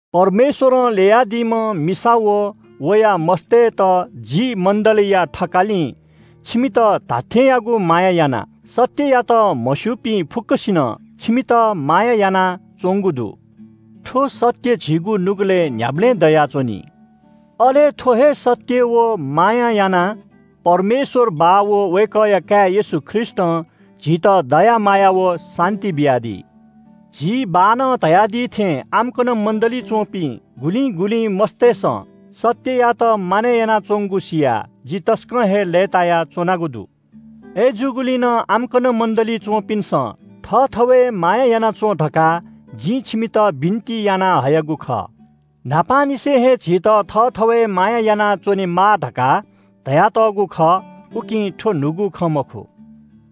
परमेश्‍वरं ल्‍ययादीम्‍ह मिसा व वया मस्‍तय्‌त जि मण्‍डलीया थकालिं छिमित धात्‍थेंयागु माया याना। सत्‍ययात म्‍हस्‍यूपिं फुक्‍कसिनं छिमित माया यानाच्‍वंगु दु। थ्‍व सत्‍य झीगु नुगलय् न्‍ह्याबलें दयाच्‍वनी। अले थ्‍व हे सत्‍य व मायां यानाः परमेश्‍वर बाः व वय्‌कःया काय् येशू ख्रीष्‍टं झीत दया माया व शान्‍ति बियादी। झी बाःनं धयादी थें आम्‍कन मण्‍डलीइ च्‍वंपिं गुलिं गुलिं मस्‍तय्‌सं सत्‍ययात मानय् यानाच्‍वंगु सियाः जि तसकं हे लय्‌तायाच्‍वनागु दु। अय्‌जूगुलिं नं आम्‍कन मण्‍डलीइ च्‍वंपिन्‍सं थःथवय् माया याना च्‍वँ धकाः जिं छिमित बिन्‍ति याना हयागु खः। न्‍हापांनिसें हे झीत थःथवय् माया यानाच्‍वनेमाः धकाः धयातःगु खः, उकिं थ्‍व न्‍हूगु खँ मखु।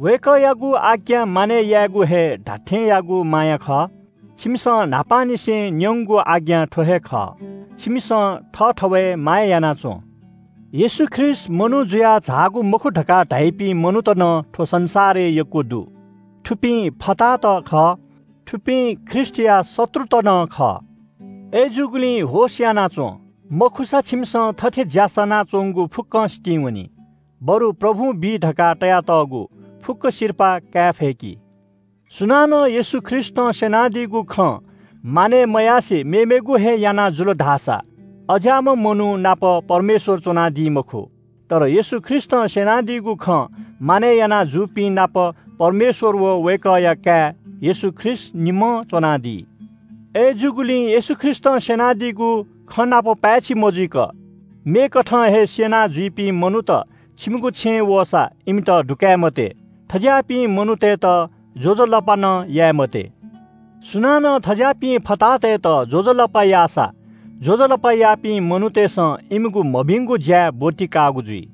वय्‌कःयागु आज्ञा मानय् यायेगु हे धात्‍थेंयागु माया खः। छिमिसं न्‍हापांनिसें न्‍यंगु आज्ञा थ्‍व हे खः – छिमिसं थःथवय् माया याना च्‍वँ। येशू ख्रीष्‍ट मनू जुयाः झाःगु मखु धकाः धाइपिं मनूत नं थ्‍व संसारय् यक्‍व दु। थुपिं फताहात खः। थुपिं ख्रीष्‍टया शत्रुत नं खः। अय्‌जूगुलिं होश‍ यानाच्‍वँ, मखुसा छिमिसं थथे ज्‍या सनाच्‍वंगु फुक्‍कं सितिं वनी। बरु प्रभुं बी धकाः तयातःगु फुक्‍क सिरपाः काये फय्‌कि। सुनानं येशू ख्रीष्‍टं स्‍यनादीगु खँ मानय् मयासें मेमेगु हे याना जुल धाःसा अज्‍याःम्‍ह मनू नाप परमेश्‍वर च्‍वनादी मखु। तर येशू ख्रीष्‍टं स्‍यनादीगु खँ मानय् याना जूपिं नाप परमेश्‍वर व वय्‌कःया काय् येशू ख्रीष्‍ट निम्‍हं च्‍वनादी। अय्‌जूगुलिं येशू ख्रीष्‍टं स्‍यनादीगु खँ नाप पाय्‌छि मजुइक मेकथं हे स्‍यना जुइपिं मनूत छिमिगु छेँय् वःसा इमित दुकाये मते। थज्‍याःपिं मनूतय्‌त ज्‍वजलपा नं याये मते। सुनानं थज्‍याःपिं फताहातय्‌त ज्‍वजलपा यासाः ज्‍वजलपा याःपिं मनूतय्‌सं इमिगु मभिंगु ज्‍याय् ब्‍वति काःगु जुइ।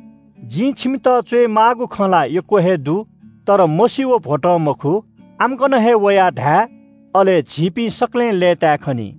जिं छिमित च्‍वये माःगु खँ ला यक्‍व हे दु। तर मसी व भ्‍वंतं मखु। आम्‍कन हे वयाः धाये, अले झीपिं सकलें लय्‌ताय् खनी।